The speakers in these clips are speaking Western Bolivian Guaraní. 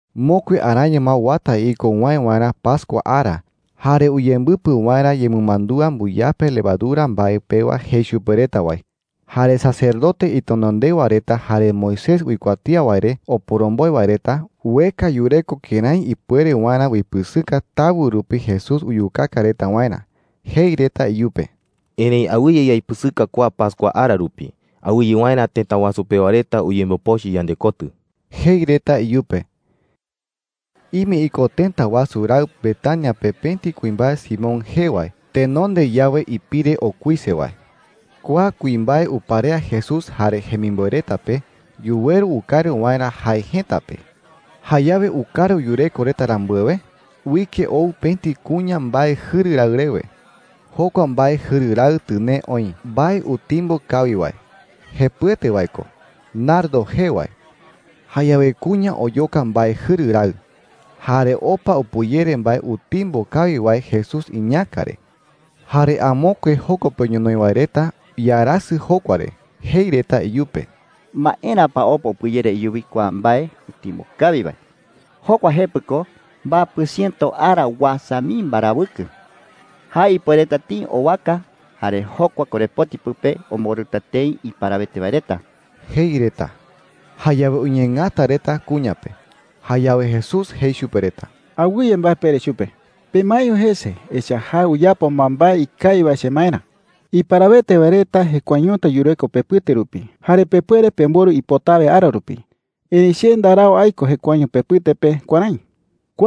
Mokui araño ma uata iko uwäe waerä pascua ara jare uyembɨpɨ waerä yemɨmandúa mbɨyape levadura mbae pewa jei chupe reta wae. Jare sacerdote itenondewa reta jare Moisés uikuatía wae re oporomboe wae reta ueka yureko kërái ipuere waerä uipɨsɨka tawɨ rupi Jesús uyukaka reta waerä. Jei reta iyupe: “Erëi awɨye yaipɨsɨka kua pascua ara rupi, awɨye waerä tëta wasu pewa reta uyembopochɨ yandekotɨ,” jei reta iyupe. Ime iko tëta wasu raɨ Betania pe pëti kuimbae Simón jee wae tenonde yawe ipire okuise wae. Kua kuimbae uparea Jesús jare jemimboe reta pe yuweru ukaru waerä jae jëta pe. Jayawe ukaru yureko reta rambuewe, uike ou pëti kuña mbae jɨru raɨ rewe. Jokua mbae jɨru raɨ tɨnee oï mbae utimbo kawi wae, jepɨete wae ko, nardo jee wae. Jayawe kuña oyoka mbae jɨru raɨ jare opa upɨyere mbae utimbo kawi wae Jesús iñäka re. Jare amokue joko pe ñonoï wae reta iarasɨ jokua re. Jei reta iyupe: “¿Maera pa opa upɨyere iyuwi kua mbae utimbo kawi wae? Jokua jepɨ ko mbapɨ chiëto ara uasa mii mbarawɨkɨ. Jae ipuereta tëi owaka, jare jokua korepoti pɨpe omborɨta tëi iparawete wae reta,” jei reta. Jayawe uñeengata reta kuña pe. Jayawe Jesús jei chupe reta: “Awɨye mbae pere chupe,” jei. “Pemaeño jese, echa’ä jae uyapo ma mbae ikawi wae chemaerä,” jei. “Iparawete wae reta jekuaeñota yureko pepɨte rupi, jare pepuere pemborɨ ipotawe ara rupi. Erëi che ndarau aiko jekuaeño pepɨte pe kuärái,” jei chupe reta.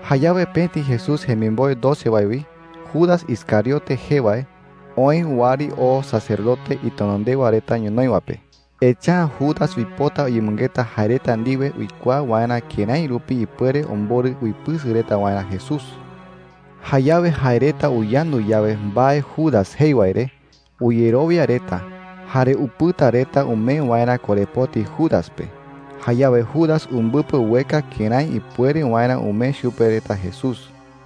Jayawe pëti Jesús jemimboe doce wae wi, Judas Iscariote jee wae, oë wɨari oo sacerdote itenondewa reta ñonoï wae pe. Echa’ä Judas uipota uyemɨngeta jae reta ndiwe uikuaa waerä kërái rupi ipuere omborɨ uipɨsɨ reta waerä Jesús. Jayawe jae reta uyandu yawe mbae Judas jei wae re, uyerowia reta, jare upɨta reta umee waerä korepoti Judas pe. Jayawe Judas umbɨpɨ ueka kërái ipuere waerä umee chupe reta Jesús.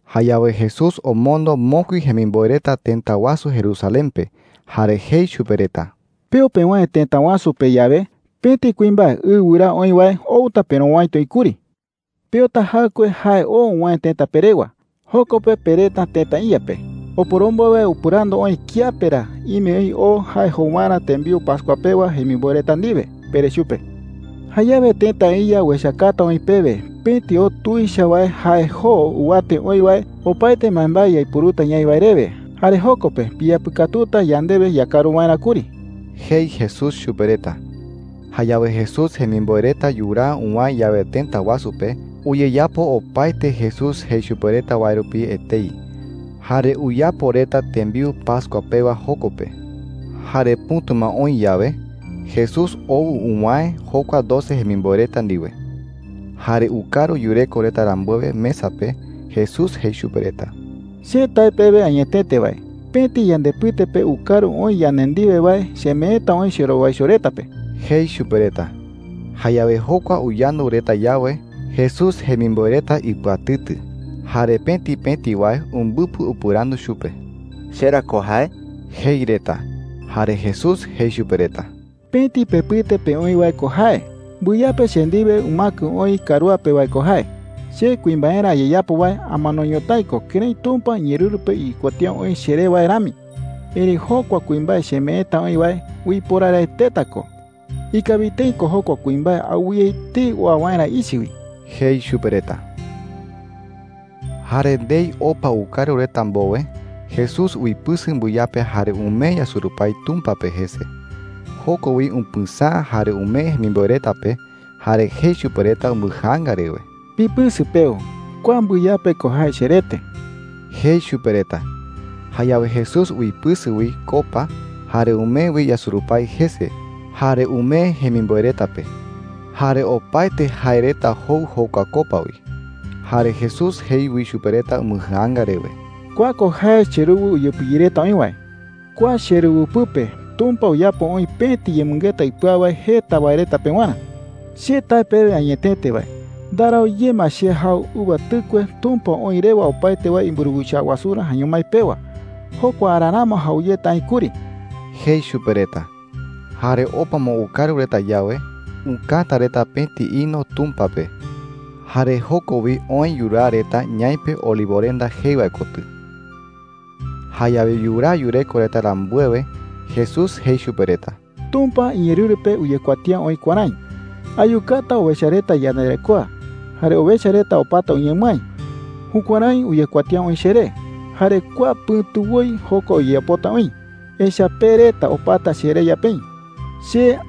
Jayawe Jesús omondo mokui jemimboe reta tëta wasu Jerusalén pe, jare jei chupe reta: “Peo pewäe tëta wasu pe yawe, pëti kuimbae ɨ wɨraa oï wae outa perowäiti oï kuri,” jei chupe reta. “Peota jaɨkue jae oo uwäe tëta pe rewa. Joko pe pereta tëta iya pe: ‘Oporomboe wae upɨrandu oï kiape ra ime oï o jae jou waerä tembiu pascua pewa jemimboe reta ndiwe,’ pere chupe,” jei. “Jayawe tëta iya uechakata oï pewe pëti o tuicha wae jae joo ɨwate oï wae, opaete mbaembae yaiporuta ñaï wae rewe. Jare joko pe piyapɨkatuta yandewe yakaru waerä kuri,” jei Jesús chupe reta. Jayawe Jesús jemimboe reta yuraa uwäe yawe tëta wasu pe, uyeyapo opaete Jesús jei chupe reta wae rupi etei. Jare uyapo reta tembiu pascua pewa joko pe. Jare pɨ̈tu ma oï yawe, Jesús ou uwäe jokua doce jemimboe reta ndiwe. Jare ukaru yureko reta rambuewe mesa pe, Jesús jei chupe reta: “Che tae pewe añetete wae, pëti yandepɨte pe ukaru oï yande ndiwe wae chemeeta oï cherowaicho reta pe,” jei chupe reta. Jayawe jokua uyandu reta yawe, Jesús jemimboe reta ipɨatɨtɨ. Jare pëti pëti wae umbɨpɨ upɨrandu chupe: “¿Che ra ko jae?” jei reta. Jare Jesús jei chupe reta: “Pëti pepɨte pe oï wae ko jae. Mbɨyape che ndiwe umäkɨ oï karúa pe wae ko jae,” jei chupe reta. “Che kuimbaerä ayeyapo wae amano ñotái ko kërái Tumpa iñeerɨru pe uyekuatía oï cheré wae rami. Erëi jokua kuimbae chemeeta oï wae uiporaraeteta ko. Ikawi tëi ko jokua kuimbae awɨye etei oa waerä ichɨ wi,” jei chupe reta. Jare ndei opa ukaru reta mbowe, Jesús uipɨsɨ mbɨyape jare umee yasurupái Tumpa pe jese. Joko wi upɨsäa jare umee jemimboe reta pe, jare jei chupe reta umbɨjaanga rewe: “Pipɨsɨ peu. Kua mbɨyape ko jae cherete,” jei chupe reta. Jayawe Jesús uipɨsɨ wi copa, jare umee wi yasurupái jese, jare umee jemimboe reta pe. Jare opaete jae reta jou jokua copa wi. Jare Jesús jei wi chupe reta umbɨjaanga rewe: “Kua ko jae cheruwɨ uyepɨyereta oï wae. Kua cheruwɨ pɨpe Tumpa uyapo oï pëti yemɨngeta ipɨau wae jeta wae reta pewarä,” jei chupe reta. “Che tae pewe añetete wae, ndarau ye ma che jau uva tɨkue Tumpa oï rewa opaete wae imburuwicha wasurä jaeño mái pewa. Jokua ara ramo jau yeta aï kuri,” jei chupe reta. Jare opa ma ukaru reta yawe, ukäta reta pëti himno Tumpa pe. Jare joko wi oë yuraa reta ñaipe Olivorenda jee wae kotɨ. Jayawe yuraa yureko reta rambuewe, Jesús jei chupe reta: “Tumpa iñeerɨru pe uyekuatía oï kuärái: ‘Ayukata owecha reta iyandarekoa, jare owecha reta opata uñemɨái.’ Jukuärái uyekuatía oï cheré. Jare kua pɨ̈tu woi jokua uyeyapota oï, echa’ä pe reta opata chereya peï,” jei chupe reta.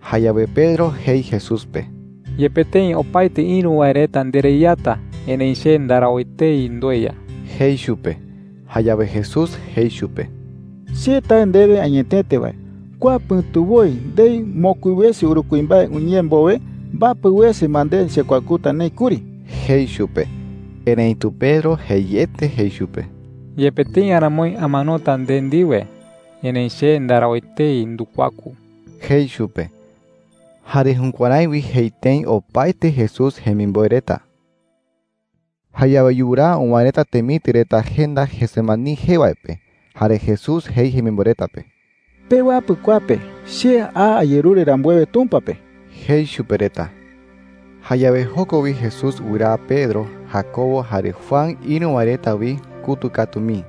Jayawe Pedro jei Jesús pe: “Yepe tëi opaetei ïru wae reta ndereyata, erëi che ndarau etei ndueya,” jei chupe. Jayawe Jesús jei chupe: “Che tae ndewe añetete wae, kua pɨ̈tu woi, ndei mokui wese uru kuimbae uñee mbowe, mbapɨ wese ma nde chekuakuta neï kuri,” jei chupe. Erëitu Pedro jeiete jei chupe: “Yepe tëi aramoi amanota nde ndiwe, erëi che ndarau etei ndukuaku,” jei chupe. Jare jukuärái wi jei tëi opaete Jesús jemimboe reta. Jayawe yuraa uwäe reta temitɨ reta jenda Getsemaní jee wae pe. Jare Jesús jei jemimboe reta pe: “Pewapɨ kua pe che a ayerure rambuewe Tumpa pe,” jei chupe reta. Jayawe joko wi Jesús wɨraa Pedro, Jacobo, jare Juan ïru wae reta wi kutɨ katu mii.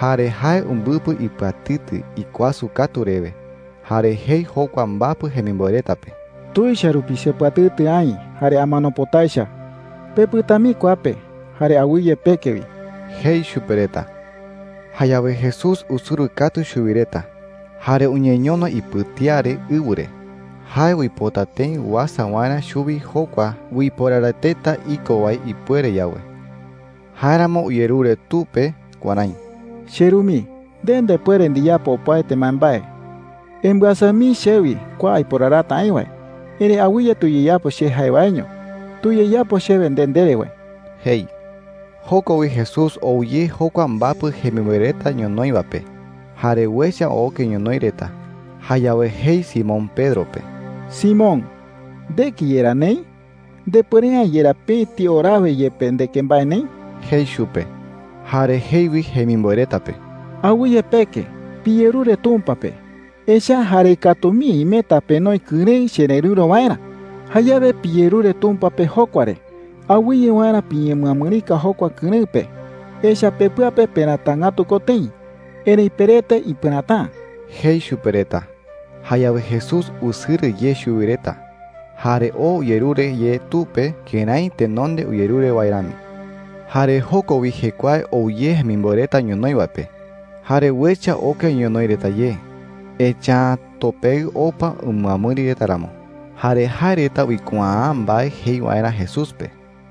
Jare jae umbɨpɨ ipɨatɨtɨ ikuasɨ katu rewe. Jare jei jokua mbapɨ jemimboe reta pe: “Tuicha rupi chepɨatɨtɨ aï jare amano pota echa. Pepɨta mii kua pe, jare awɨye peke wi,” jei chupe reta. Jayawe Jesús usɨrɨ katu chuwi reta, jare uñeñono ipɨtía re ɨwɨ re. Jae uipota tëi uasa waerä chuwi jokua uiporaraeteta iko wae ipuere yawe. Jáeramo uyerure Tu pe kuärái: “CheRu mii, nde ndepuere ndiyapo opaete mbaembae. Embɨasa mii chewi kua aiporarata aï wae. Erëi awɨye tuyeyapo che jae waeño. Tuyeyapo chewe nde ndere wae,” jei. Joko wi Jesús ou ye jokua mbapɨ jemimboe reta ñonoï wae pe, jare uecha oke ñonoï reta. Jayawe jei Simón Pedro pe: “Simón, ¿ndeke yerá neï? ¿Ndepuere’ä yerá pëti orawe yepe ndeke mbae neï?” jei chupe. Jare jei wi jemimboe reta pe: “Awɨye peke. Piyerure Tumpa pe, echa’ä jarei katu mii imeta penoi kɨrëɨ chererɨ̈ro waerä. Jayawe piyerure Tumpa pe jokua re awɨye waerä piñemɨamɨrika jokua kɨrëɨ pe. Echa’ä pepɨa pe peratangätu ko tëi, erëi perete ipɨräta’ä,” jei chupe reta. Jayawe Jesús usɨrɨ ye chuwi reta, jare oo uyerure ye Tu pe kërái tenonde uyerure wae rami. Jare joko wi jekuae ou ye jemimboe reta ñonoï wae pe. Jare uecha oke ñonoï reta ye, echa’ä topeɨ opa umɨamɨri reta ramo. Jare jae reta uikuaa’ä mbae jei waerä Jesús pe.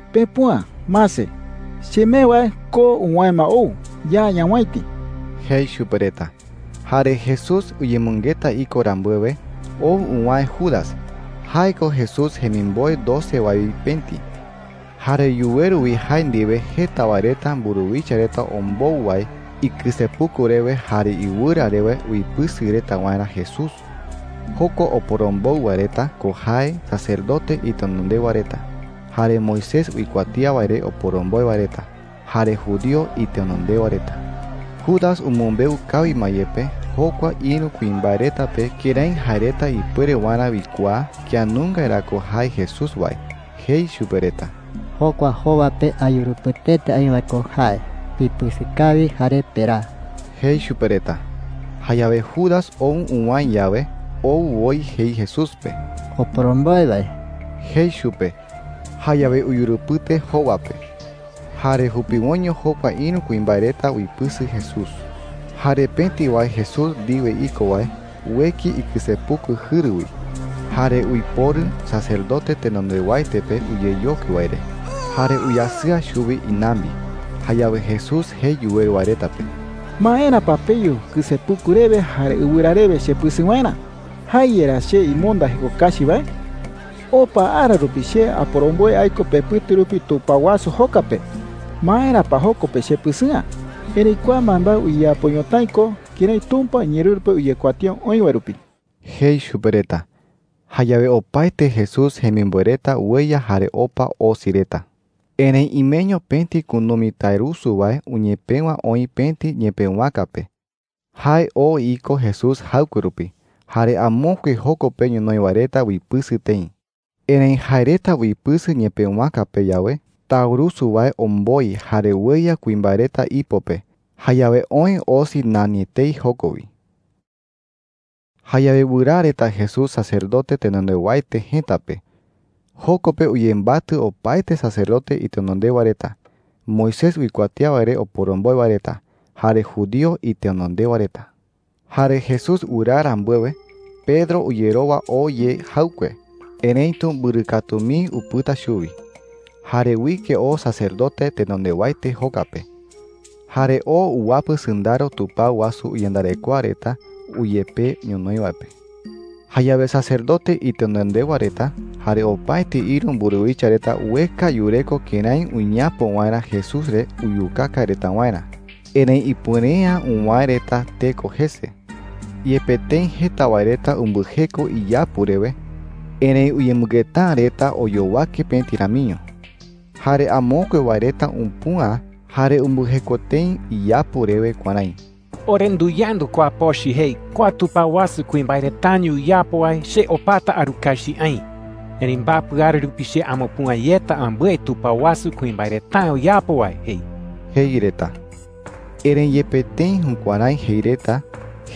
“Pepüa. Mase, chemee wae ko uwäe ma ou. Ya ñawäiti,” jei chupe reta. Jare Jesús uyemɨngeta iko rambuewe, ou uwäe Judas. Jae ko Jesús jemimboe doce wae wi pëti. Jare yuweru wi jae ndiwe jeta wae reta mburuwicha reta ombou wae ikɨsepuku rewe jare iɨwɨra rewe uipɨsɨ reta waerä Jesús. Jokua oporombou wae reta ko jae sacerdote itenondewa reta, jare Moisés uikuatía wae re oporomboe wae reta, jare judío itenondewa reta. Judas umɨmbeu kawi ma yepe jokua ïru kuimbae reta pe kërái jae reta ipuere waerä uikuaa kía nunga ra ko jae Jesús wae. Jei chupe reta: “Jokua jowa pe ayurupɨteta aï wae ko jae. Pipɨsɨ kawi jare peraa,” jei chupe reta. Jayawe Judas ou uwäe yawe, ou woi jei Jesús pe: “Oporomboe wae,” jei chupe. Jayawe uyurupɨte jowa pe. Jare jupiwoiño jokua ïru kuimbae reta uipɨsɨ Jesús. Jare pëti wae Jesús ndiwe iko wae ueki ikɨsepuku jɨru wi, jare uiporu sacerdote tenondewaete pe uyeyokui wae re, jare uyasɨa chuwi inambi. Jayawe Jesús jei yuweru wae reta pe: “¿Maera pa peyu kɨsepuku rewe jare ɨwɨra rewe chepɨsɨ waerä? ¿Jae yerá che imonda jeko kachi wae?” jei chupe reta. “Opa ara rupi che aporomboe aiko pepɨte rupi tupao wasu joka pe. ¿Maera pa joko pe chepɨsɨ'ä?” jei. “Erëi kua mbaembae uyeyapo ñotái ko kërái Tumpa iñeerɨru pe uyekuatía oï wae rupi,” jei chupe reta. Jayawe opaete Jesús jemimboe reta ueya jare opa osi reta. Erëi imeño pëti kunumi taurusu wae uñepëwa oï pëti ñepëwaka pe. Jae oo iko Jesús jaɨkue rupi. Jare amokue joko pe ñonoï wae reta uipɨsɨ tëi. Erëi jae reta uipɨsɨ ñepëwaka pe yawe, taurusu wae omboi jare ueya kuimbae reta ipo pe. Jayawe oë osi nani etei joko wi. Jayawe wɨraa reta Jesús sacerdote tenondewaete jëta pe. Joko pe uyembatɨ opaete sacerdote itenondewa reta, Moisés uikuatía wae re oporomboe wae reta, jare judío itenondewa reta. Jare Jesús wɨraa rambuewe, Pedro uyerowa oo ye jaɨkue. Erëitu mbɨrɨ katu mii upɨta chuwi. Jare uike oo sacerdote tenondewaete joka pe, jare oo uwapɨ sɨndaro tupao wasu iyandarekoa reta uyepee ñonoï wae pe. Jayawe sacerdote itenondewa reta jare opaete ïru mburuwicha reta ueka yureko kërái uñeapo waerä Jesús re uyukaka reta waerä. Erëi ipuere’ä uwäe reta teko jese. Yepe tëi jeta wae reta umbɨjeko iyapu rewe, erëi uyemɨngeta’ä reta oyowake pëti ramiño. Jare amokue wae reta upüa jare umbɨjeko tëi iyapu rewe kuärái: “Ore nduyandu kua pochɨ jei, ‘Kua tupao wasu kuimbae retaño uyapo wae, che opata arukachi aï. Erëi mbapɨ ara rupi che amupüa yeta ambɨe tupao wasu kuimbae reta’ä uyapo wae,’ jei,” jei reta. Erëi yepe tëi jukuärái jei reta,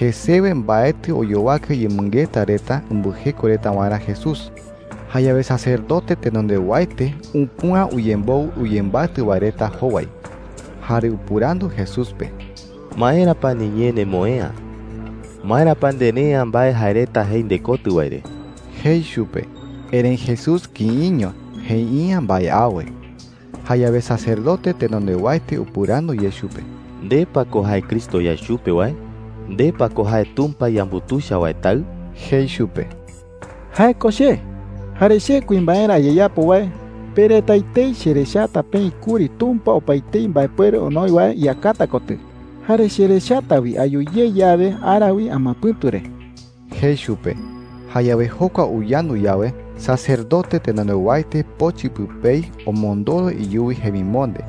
jesewe mbaetɨ oyowake uyemɨngeta reta umbɨjeko reta waerä Jesús. Jayawe sacerdote tenondewaete upüa uyemboɨ uyembatɨ wae reta jowai, jare upɨrandu Jesús pe: “¿Maera pa niñee nemoë'ä? ¿Maera pa nde ndere’ä mbae jae reta jei ndekotɨ wae re?” jei chupe. Erëi Jesús kïiño. Jei’ä mbae awe. Jayawe sacerdote tenondewaete upɨrandu ye chupe: “¿Nde pa ko jae Cristo yae chupe wae? ¿Nde pa ko jae Tumpa yambutuicha wae Taɨ?” jei chupe. “Jae ko che,” jei Jesús chupe. “Jare che kuimbaerä ayeyapo wae, pe reta etei cherechata peï kuri Tumpa opaetei mbaepuere onoi wae iyakata kotɨ. Jare cherechata wi ayu ye yawe ara wi amapɨ̈tu re,” jei chupe. Jayawe jokua uyandu yawe, sacerdote tenondewaete pochɨ pɨpei omondoro iyuwi jemimonde.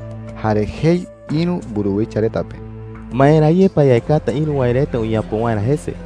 Jare jei ïru mburuwicha reta pe: “¿Maera ye pa yaekata ïru wae reta uñeapo waerä jese?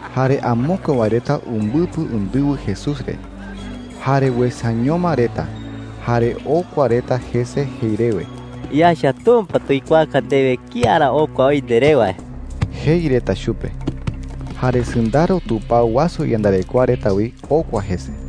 Jare amokue wae reta umbɨpɨ undɨwɨ Jesús re. Jare uesañoma reta jare okua reta jese jei rewe: “Yaecha Tumpa tuikuaaka ndewe kía ra okua oï nderé wae,” jei reta chupe. Jare sɨndaro tupao wasu iyandarekoa reta wi okua jese.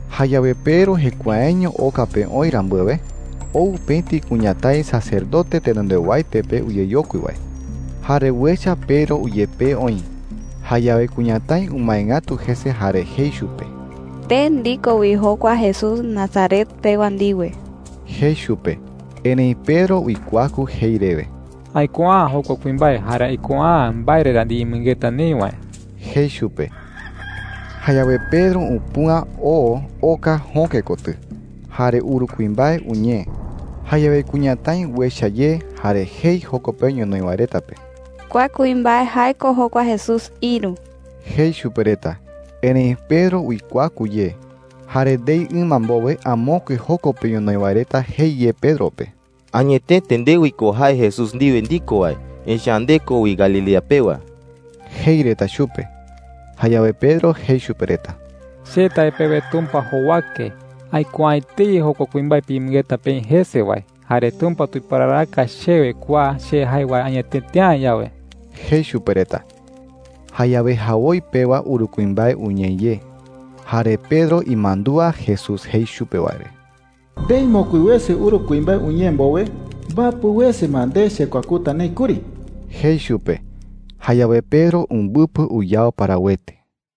Jayawe Pedro jekuaeño oka pe oï rambuewe, ou pëti kuñatái sacerdote tenondewaete pe uyeyokui wae. Jare uecha Pedro uyepee oï. Jayawe kuñatái umae ngatu jese jare jei chupe: “Nde ndiko wi jokua Jesús Nazaret pewa ndiwe,” jei chupe. Erëi Pedro uikuaku jei rewe: “Aikuaa’ä jokua kuimbae, jare aikuaa’ä mbae re ra ndiyemɨngeta neï wae,” jei chupe. Jayawe Pedro upüa oo oka jöke kotɨ. Jare uru kuimbae uñee. Jayawe kuñatái uecha ye, jare jei joko pe ñonoï wae reta pe: “Kua kuimbae, jae ko jokua Jesús ïru,” jei chupe reta. Erëi Pedro uikuaku ye. Jare ndei ɨma mbowe amokue joko pe ñonoï wae reta jei ye Pedro pe: “Añetete nde wi ko jae Jesús ndiwe ndiko wae, echa’ä nde ko wi Galilea pewa,” jei reta chupe. Jayawe Pedro jei chupe reta: “Che tae pewe Tumpa jowake, ¡aikuaa’ä etei jokua kuimbae piyemɨngeta peï jese wae! Jare Tumpa tuiporaraka chewe kua che jae wae añetete’ä yawe,” jei chupe reta. Jayawe jawoi pewa uru kuimbae uñee ye. Jare Pedro imandúa Jesús jei chupe wae re: “Ndei mokui wese uru kuimbae uñee mbowe, mbapɨ wese ma nde chekuakuta neï kuri,” jei chupe. Jayawe Pedro umbɨpɨ uyao parawete.